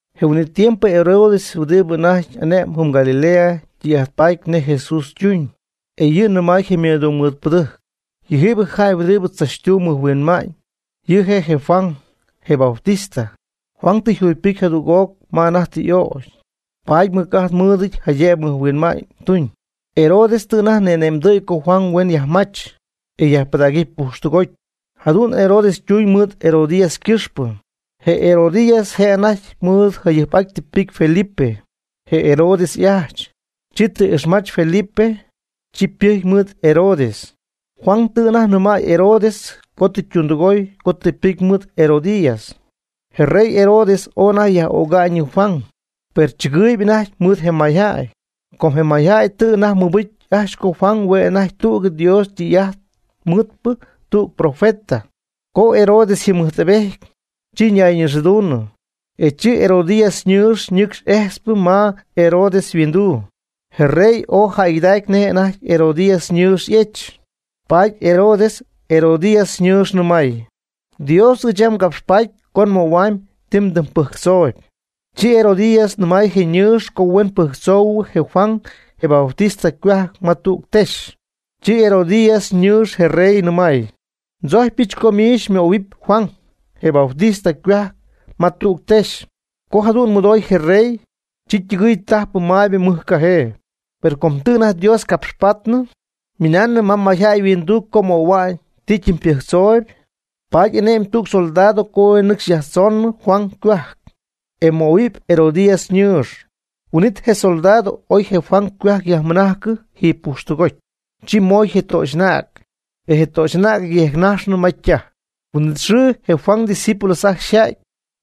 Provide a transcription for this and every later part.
Je huin'it tiempo Herodes huɨdibɨ anajty ane'mb jɨm Galilea tɨy'ajt paty nej Jesús ytuñ. E yɨ' nɨmay je ymɨdungmɨɨdpɨdɨjc: ―Yɨjiibɨ jäy huɨdibɨ tzachtumb mɨjhuinma'ñ, yɨ' je' je Juan, je Bautista. Juan tɨ jugypɨcy jadüg'oc ma anajty tɨ y'ögy, paady mɨc'ajt mɨɨd jaydëb mɨjhuinma'ñ tuñ. Herodes tɨ anajty ni'ane'mdɨ̈y co Juan huen yajmach, e yajpɨdägɨpy pujxtɨgoty. Jadu'n Herodes tuñ mɨɨd Herodías ycɨxpɨ. Je Herodías je' anajty mɨɨd jayɨjp'aty tɨ ypɨcy Felipe, je Herodes y'ajch, chi tɨ ixmajch Felipe, chi ypɨjcy mɨɨd Herodes. Juan tɨ anajty nɨmäy Herodes co tɨ ytundɨgooy co tɨ pɨcy mɨɨd Herodías. Je rey Herodes ooy anajty jayaj'öga'ñ yɨ Juan, per tzɨgɨɨyb anajty mɨɨd je mayjäy. Com je mayjäy tɨ anajty mɨbɨcy ajcxy co Juan hue' anajty tügɨ Dios tɨy'ajt mɨɨdpɨ, tüg profeta. Co Herodes yjɨmɨjtpejty, chi anajty ñayñixɨɨduñyii, e chi Herodías ñɨɨx ñɨcxy ejtzp ma Herodes yhuinduu. Je rey ooy jäygɨdacy nej anajty Herodías ñɨɨx y'ejch. Paady Herodes Herodías ñɨɨx nɨmay: ―Dios ɨɨch yam ngapxpatpy co nmöhuamyb ti mdɨmypɨjctzooyb. Chi Herodías nɨmay je' ñɨɨx co huen pɨjctzoohuɨ je Juan, je Bautista, ycohuajc ma tüg texy. Chi Herodías ñɨɨx je rey nɨmay: ―Ndzojcypɨch co miich xymöhuɨp Juan, je Bautista, ycohuajc ma tüg texy. Co jadu'n mɨdooy je rey, chi ytɨgɨɨy tajp maybɨ mɨj cajee. Per co tɨ anajty Dios capxpaatnɨ, ymɨnaanɨ mayjäy yhuinduu co ymöhuamyb tijaty ypɨjctzooyb. Paady ane'my tüg soldado co huen nɨcxy yajtzoñyii Juan ycohuajc, e möhuɨpy Herodías ñɨɨx. Huin'it je soldado oy je Juan ycohuajc yajmɨnajcɨ jiiby pujxtɨgoty. Chi moy je töxy'anäg, e je töxy'anäg yejcnajxnɨ ma ytaj. Huin'it xɨɨ je Juan ydiscípulos ajcxy yja'ty.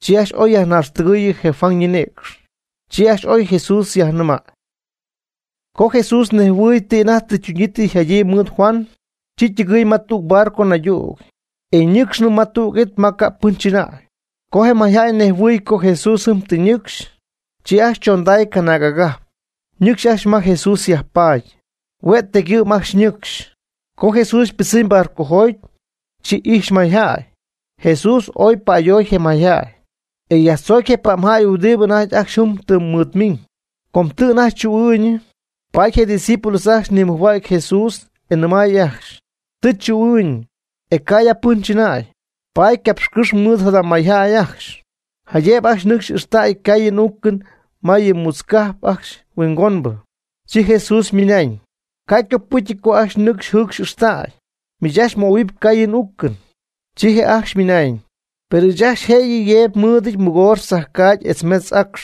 Chi ajcxy oy yajnaaxtɨgɨ̈y je Juan ñinïcx. Chi ajcxy oy Jesús yajnɨmäy. Co Jesús nejhuɨɨy ti anajty tɨ ytuñyii tɨ yjadyii mɨɨd Juan, chi ytɨgɨɨy ma tüg barco naydüg, e nɨcxnɨ ma tüg it ma ca' pɨn chɨnäy. Co je mayjäy nejhuɨy co Jesús tɨ ñɨcxy, chi ajcxy chonday canaag agajp, nɨcxy ajcxy ma Jesús yajpaady, hue' tecygɨ'm ajcxy nɨcxy. Co Jesús ypɨdzɨmy barcojoty, chi ijxy mayjäy. Jesús ooy pa'ayoy je mayjäy, e yajtzoocy je pa'mjäy huɨdibɨ anajty ajcxy jɨm ymɨɨd miiñ. Com tɨ anajty chuu'ɨɨñɨ, paady je' ydiscípulos ajcxy nimɨjhua'cy Jesús, e nɨmay ajcxy: ―Tɨ chuu'ɨɨñ, e ca' ya pɨn chɨna'y, paady capxcɨ́xy mɨɨd jada mayjäy ajcxy, jaydëb ajcxy nɨcxy ixtäy ycaayɨn y'uucɨn ma yɨ mutz cajp ajcxy huingonbɨ. Chi Jesús ymɨnañ: ―Ca' ycopɨcyɨty co ajcxy nɨcxy jɨcxy ixtäy. Miich ajcxy möhuɨp caayɨn uucɨn. Chi je' ajcxy ymɨnañ: ―Per ɨɨch ajcxy jëyɨ yeeby nmɨɨdɨty mɨgoox tzajcaagy etz metz acx.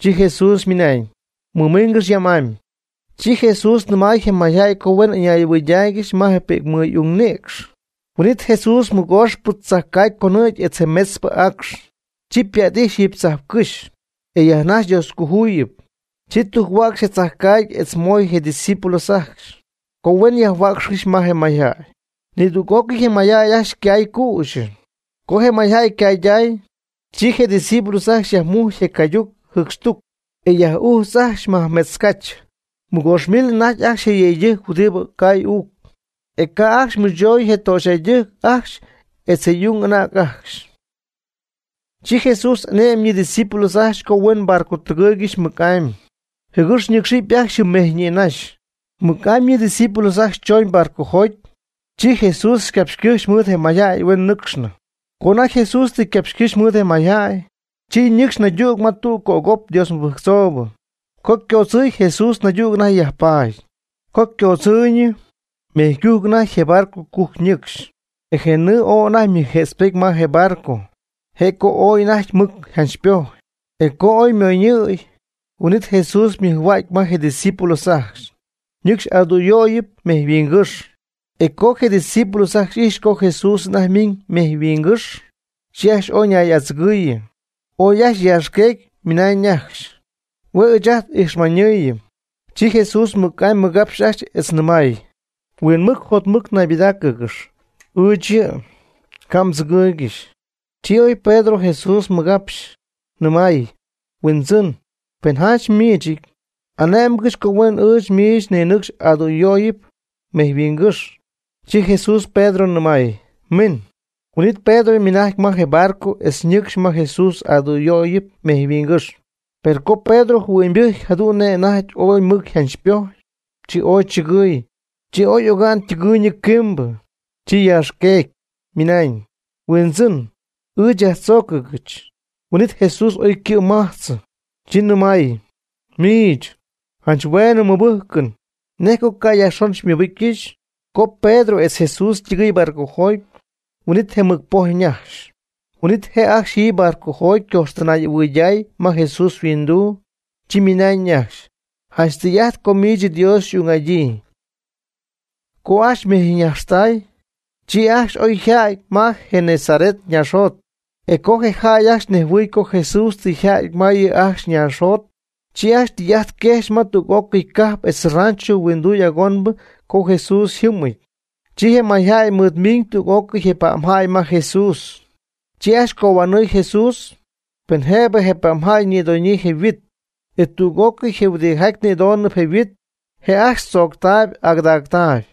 Chi Jesús ymɨnañ: ―Mɨmiingɨx yam'amy. Chi Jesús nɨmay je mayjäy co huen ɨñay'ɨhuɨydaaygɨxy ma pi'cmɨɨy'ung nïcx. Huin'it Jesús je mɨgooxpɨ tzajcaagy conɨ̈gy etz je metzpɨ acx. Chi ypa't'ijxy jiiby tzajpcɨ́xy, e yajnajxy Dioscojuyipy. Chi tujc-huäcxy je tzajcaagy etz moy je' ydiscípulos ajcxy, co huen yajhuäcxycɨxy ma je mayjäy. Nidüg'ócɨy je mayjäy ajcxy ycay cüxyɨ. Co je mayjäy ycayday, chi je discípulos ajcxy yajmujcy je cayduc jɨcxtuc, e yaj'ujch ajcxy majmetz cach. Mɨgoox mil anajty ajcxy je yëydɨjctɨjc huɨdibɨ cay uuc. E ca' ajcxy mɨchoy je töxyjäydɨjc ajcxy etz je y'ung y'anäg ajcxy. Chi Jesús ane'my yɨ' ydiscípulos ajcxy co huen barco tɨgɨɨygɨxy mɨc'amy, jɨgɨx ñɨcxɨpy ajcxy jɨm mejy nïnaxy. Namɨ yɨ' ydiscípulos ajcxy choñ barcojoty, Jesús ycapxycɨ́jxy mɨɨd je mayjäy huen nɨ́cxcɨxnɨ. Co anajty Jesús tɨ ycapxycɨ́xy mɨɨd je mayjäy, chi ñɨcxy naydüg ma tüg cögop Dios mɨbɨjctzoobɨ. Co ycoodzɨɨñ Jesús naydüg anajty yajpaady. Co ycoodzɨɨñ, mejy cujc anajty je barco cujc nɨcxy. E je nɨɨ ooy anajty ymɨjjëtzpety ma je barco, je' co ooy anajty mɨc yjanchpojy. E co oy ymoñɨ̈y, huin'it Jesús ymɨjhua'cy ma je' ydiscípulos ajcxy, ñɨcxy adüyöyb mejyhuingɨ́xy. E co je discípulos ajcxy ijxy co Jesús anajty ymiiñ mejyhuingɨ́xy, chi ajcxy ooy ñay'adzɨgɨɨyɨ. Ooy ajcxy yaaxqueecy ymɨnañ ajcxy: ―Hue' ɨɨch ajt ijxmanɨɨyɨm. Chi Jesús mɨc'amy ymɨgapxy ajcxy etz nɨmay: ―Huinmɨc jotmɨc naybɨdáacɨgɨxy, ɨɨch yɨ'. Ca' mdzɨgɨɨygɨxy. Chi oy Pedro Jesús ymɨgapxyii, nɨmaayɨ: ―Huindzɨn, pen janch miichɨty, ane'mgɨch co huen ɨɨch miich ninɨcxɨp adüyöyɨp mejyhuingɨ́xy. Chi Jesús Pedro nɨmay: ―Min. Huin'it Pedro ymɨnajcy ma je barco etz ñɨcx ma Jesús adüyöyɨp mejyhuingɨ́xy. Per co Pedro jɨhuɨ'ñybɨjcy jadu'n nej anajty ooy mɨc yjanchpojy, chi ooy chɨgɨy, chi oy oga'n ytɨgɨɨyñɨ quimbɨ, chi yaaxqueecy, ymɨnañ: ―¡Huindzɨn, ɨɨch yajtzóocɨgɨch! Huin'it Jesús oy ycɨ' mɨmajtzɨ, chi nɨmay: ―Miich, janch hueenɨ mmɨbɨjcɨn. ¿Nej co ca' yajxon xymɨbɨcyɨch? Co Pedro etz Jesús ytɨgɨɨy barcojoty, huin'it je mɨc poj ñajxy. Huin'it je' ajcxy jiiby barcojoty ycojxtɨnay'ɨhuɨydaay ma Jesús yhuinduu. Chi ymɨnañ ajcxy: ―Janch tɨy'ajt co miich Dios xy'ung'adyii. Co ajcxy ymejyñajxtay, chi ajcxy oy ja'ty ma je Genesaret naaxjot. E co je jäy ajcxy nejhuɨɨy co Jesús tɨ yjäty ma yɨ' ajcxy naaxjot, chi ajcxy tɨy'ajt quejxy ma tüg'ócɨy cajp etz rancho huinduy agonbɨ co Jesús yjɨmɨty. Chi je mayjäy mɨɨd miiñ tüg'ócɨy je pa'mjäy ma Jesús. Chi ajcxy cohuanɨɨy Jesús, pen jëb je pa'mjäy ñïdoñyii je yhuit. E tüg'ócɨy je huɨdijaty ñïdonɨp je' yhuit, je' ajcxy chooctay y'agɨdactay.